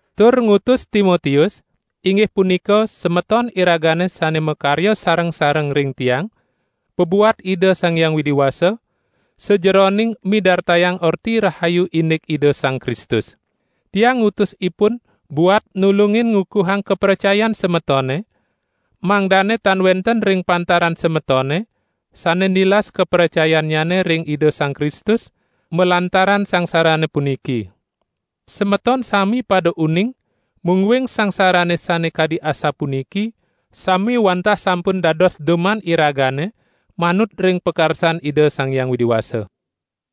tur ngutus Timotius, inggih punika semeton iragane sane makarya sareng-sareng ring tiang pabuat Ida Sang Hyang Widi Wasa, sajeroning midartayang Orti Rahayu indik Ida Sang Kristus. Tiang ngutus ipun buat nulungin ngukuhang kapracayan semetone, mangdane tan wenten ring pantaran semetone sane nilas kapracayannyane ring Ida Sang Kristus, malantaran sangsarane puniki. Semeton sami pada uning, mungguing sangsarane sane kadi asapuniki sami wantah sampun dados duman iragane manut ring pakarsan Ida Sang Hyang Widi Wasa.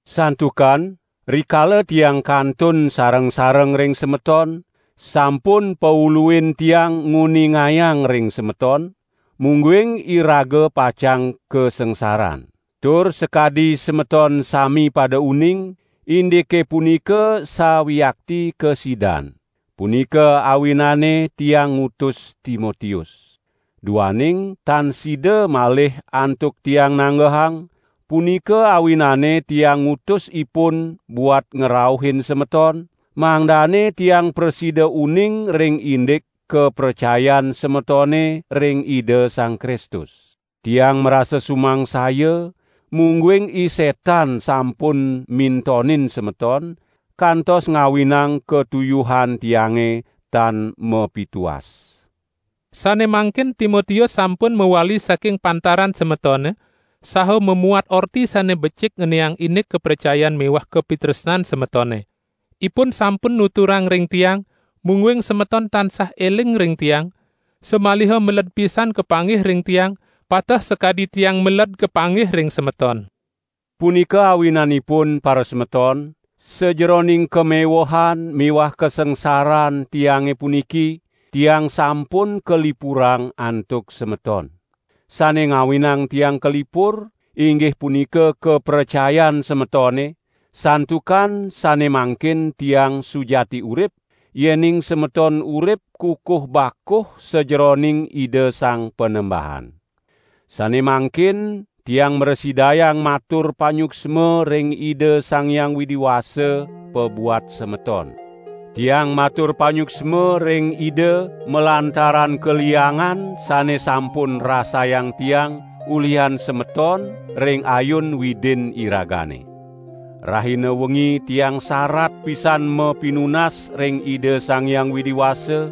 Santukan rikala tiang kantun sareng-sareng ring semeton, sampun pauluin tiang nguningayang ring semeton, mungguing iraga pacang kasangsaran. Tur sakadi semeton sami pada uning, indike punika sawiakti kasidan. Punika awinane tiang ngutus Timotius. Duaning tan sida malih antuk tiang nanggehang, punika awinane tiang ngutus ipun buat ngrauhin semeton, mangdane tiang prasida uning ring indik kapracayan semetone ring Ida Sang Kristus. Tiang marasa sumangsaya, mungguing I Setan sampun mintonin semeton, kantos ngawinang katuyuhan tiange tan mapituas. Sane mangkin Timotius sampun mawali saking pantaran semetone, saha mamuat orti sane becik ngeniang indik kapracayan miwah kapitresnan semetone. Ipun sampun nuturang ring tiang, mungguing semeton tansah eling ring tiang, samaliha meled pisan kapanggih ring tiang, pateh sakadi tiang meled kapanggih ring semeton. Punika awinanipun parasemeton, sajeroning kamewehan miwah kasangsaran tiange puniki, tiang sampun kalipurang antuk semeton. Sane ngawinang tiang kalipur, inggih punika kapracayan semetone, santukan sane mangkin tiang sujati urip, yening semeton urip kukuh bakuh sajeroning Ida Sang Panembahan. Sane mangkin tiang mrasidayang matur panyuksma ring Ida Sang Hyang Widi Wasa pabuat semeton. Tiang matur panyuksma ring Ida malantaran kaliangan sane sampun rasayang tiang ulihan semeton ring ayun Widin iragane. Rahina wengi tiang sarat pisan mapinunas ring Ida Sang Hyang Widi Wasa,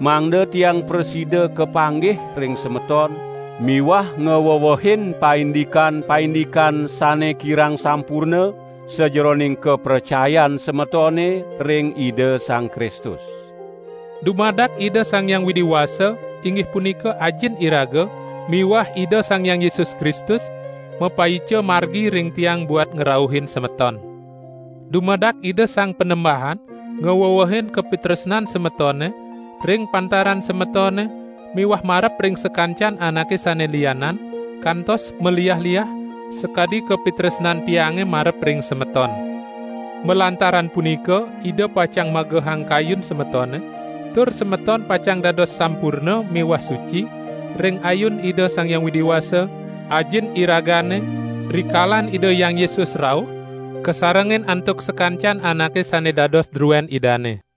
mangda tiang prasida kapanggih ring semeton miwah ngwewehin paindikan-paindikan sane kirang sampurna, sajeroning kapracayan semetone ring Ida Sang Kristus. Dumadak Ida Sang Hyang Widi Wasa, inggih punika Ajin iraga miwah Ida Sang Hyang Yesus Kristus mapaica margi ring tiang buat ngrauhin semeton. Dumadak Ida Sang Panembahan ngwewehin kapitresnan semetone ring pantaran semetone miwah marep ring sakancan anake sane lianan kantos maliah-liah, sakadi kapitresnan tiange marep ring semeton. Malantaran punika Ida pacang magehang kayun semetone, tur semeton pacang dados sampurna miwah suci ring ayun Ida Sang Hyang Widi Wasa, Ajin iragane, rikalan Ida Hyang Yesus rauh kasarengin antuk sakancan anake sane dados druen Idane.